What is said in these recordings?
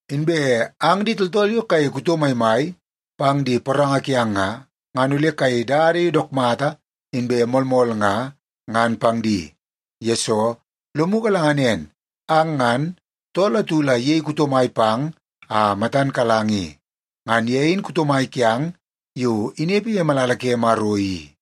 Inbe ang di tooltool yo kayei kuto maimai pang di poranga kiang nga, ngan ole kayei dada yo dook mata inbe moolmool nga, ngan pang di. Yesoo, lomu galanga nen, ang ngan, tool atu la iyei kuto mai pang a matan kalang i. Ngan ye in kuto mai kiang yo inepe ye malala ke Maro i.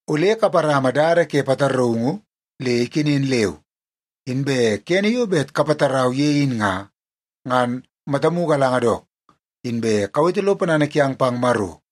Ole kaparama dada ke pataraungu le ikenen leu. Inbe kene yo bet kapatarau ye in nga, ngan matamu galanga dook, inbe kawete lo ponana kiang pang Maro.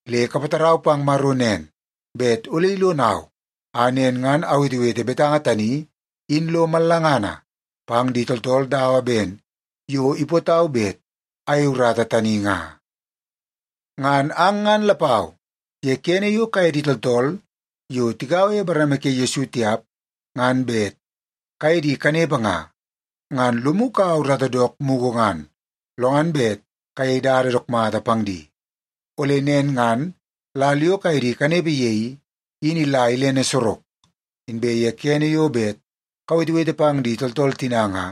Le kapatarau pang Maro nen, bet ole ilonau a nen ngan awetewete betanga tani in lo mallangana pang di tooltool dawa ben yo ipootau bet ayeie urata tani nga. Ngan ang ngan lapau, ye kene yo kaye di tooltool yo tigaua ye bareme ke Yesu tiap ngan bet kaye di kanepe nga, ngan lomu kaua urata dook mugu ngan, lo ngan bet kayei dada dook mata pang di. Ole nen ngan lal yo kaye di kanepe ye i, in ila ilene sorok. Inbe ye kene yo bet kawetewete pang di tooltool tina nga,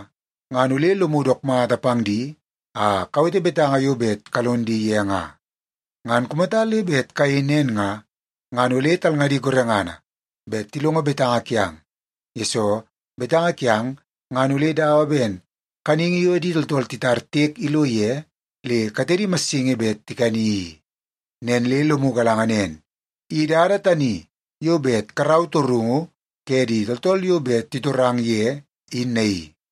ngan ole lomu dook mata pang di a kawete betanga yo bet kalon di ye nga. Ngan kumata le bet kayei nen nga, ngan ole talngadi gorengana bet tilongo betanga kiang, yesoo betanga kiang ngan ole dawa ben kaningi yo di tooltool titar tiek ilo ye le katedi massingi bet tikani i. Nen le lomu galanga nen, i dada tani yo bet karau torungu ke di tooltool yo bet titorang ye, in naii.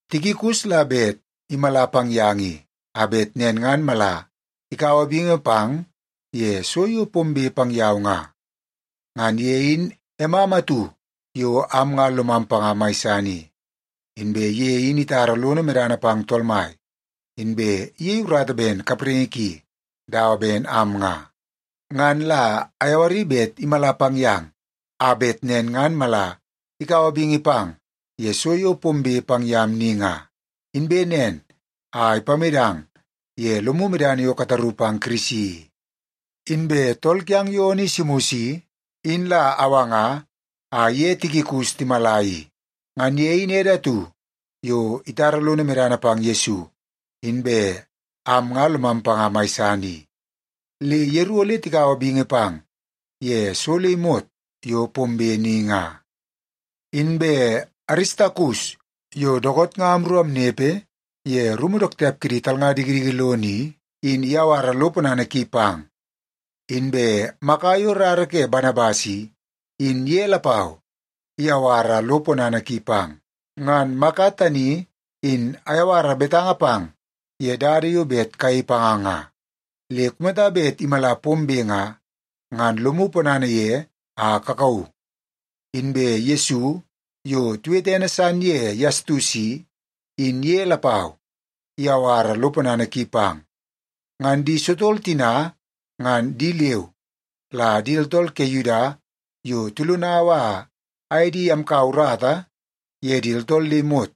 Tikikus la bet imala pang yang i, a bet nen ngan mala ikaua bingi pang ye so yo pombe pang yau nga. Ngan ye in emam atu yo am nga lomam panga mai san i. Inbe ye in itara lono medana pang Tool Mai, inbe iyei urata ben kapraingi ki dawa ben am nga. Ngan la ayawari bet imala pang yang, a bet nen ngan mala ikaua bingi pang ye so yo pombe pang yam ni nga, inbe nen a ipamedang ye lomu medana yo kataru pang Kirisi i. Inbe tool kiang yo Onesimus i, in la awanga a iye Tikikus timala i. Ngan ye in ede atu yo itara lono medana pang Yesu, inbe am nga lomam panga mai san i. Le yeru ole tikaua bingi pang ye so le imot yo pombe ni nga. Inbe Aristakus yo dookoot nga amru amnepe ye rumu dook tiap kidi talnga dikidiki lono i, in iyawara lo ponana ki pang. Inbe Maka yo rara ke Banabas i, in ye lapau iyawara lo ponana ki pang. Ngan Maka tani in ayawara betanga pang ye dada yo bet kayei panga nga. Le kumata bet imala pombe nga, ngan lomu ponana ye a kakauu. Inbe Yesu, yo tiwete ene san ye Yastus i, in ye lapau iyawara lo ponana ki pang. Ngan di sotol tina nga di leu la di tooltool ke Yuda yo tilonau a aye di amkaua urata ye di tooltool le imot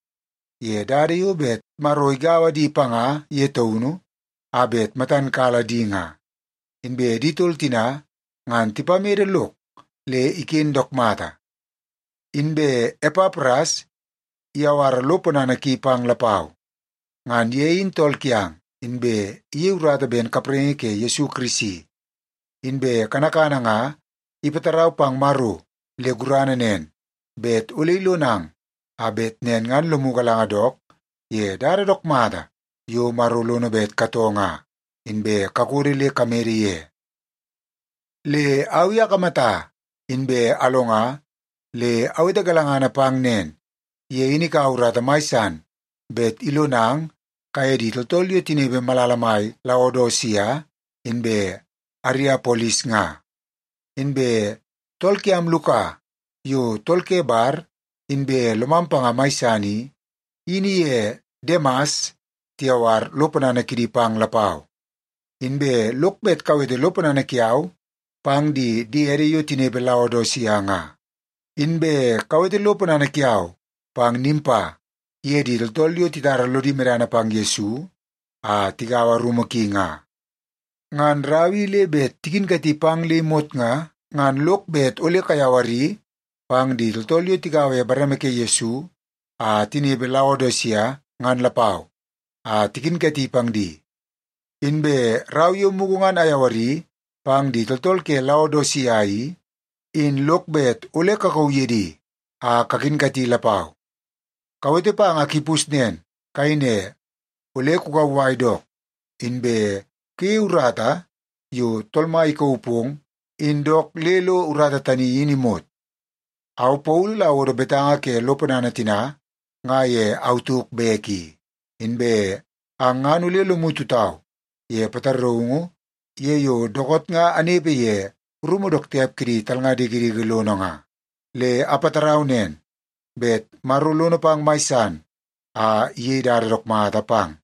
ye dada yo bet Maro igaua di panga ye taunu a bet matan kala di nga. Inbe di tol tina nga tipamede lok le iken dook mata. Inbe Epapras iyawara lo ponana ki pang lapau. Ngan ye in tool kiang, inbe iyei urata ben kapraingi ke Yesu Kirisi. Inbe kanakana nga ipatarau pang Maro le gurana nen, bet ole ilonang a bet nen ngan lomu galanga dook ye dada dook mata yo Maro lono bet katoo nga, inbe kakodo le kamede ye. Le au i akamata inbe alonga le awete galangana pang nen, ye in ikaua urata mai san bet ilonang kaye di tooltool yo tinepe malala mai Laodisia inbe Ariapolis nga. Inbe tool kiam Luka, yo tool ke bar inbe lomam panga mai san i, in iye Demas tiyawar lo ponana kidi pang lapau. Inbe lok bet kawete lo ponana kiau pang di diede yo tinepe Laodisia nga. Inbe kawete lo ponana kiau pang Nimpa iye di tooltool yo titara lodi medana pang Yesu a tigaua rumu ki nga. Ngan rau i le bet tikinkati pang le imot nga, ngan lok bet ole kayawari pang di tooltool yo tigaua ye bareme ke Yesu a tinepe Laodisia ngan lapau a tikinkati pang di. Inbe rau yo mugu ngan ayawari pang di tooltool ke Laodisia i, in lok bet ole kakauu ye di a kakinkati lapau. Kawete pang Akipus nen, kayei ne, “Ole kukauwai dook, inbe kuyeie urata yo Tool Mai ikauu pong in dook le lo urata tani in imot.” Au Paulu la awodo betanga ke lo ponana tina nga ye au tauk bek i. Inbe ang ngan ole lomu tutau ye pataraungu ye yo dookoot nga anepe ye rumu dook tiap kidi talnga dikidiki lono nga. Le apatarau nen, bet Maro lono pang mai san a iyei dada dook mata pang.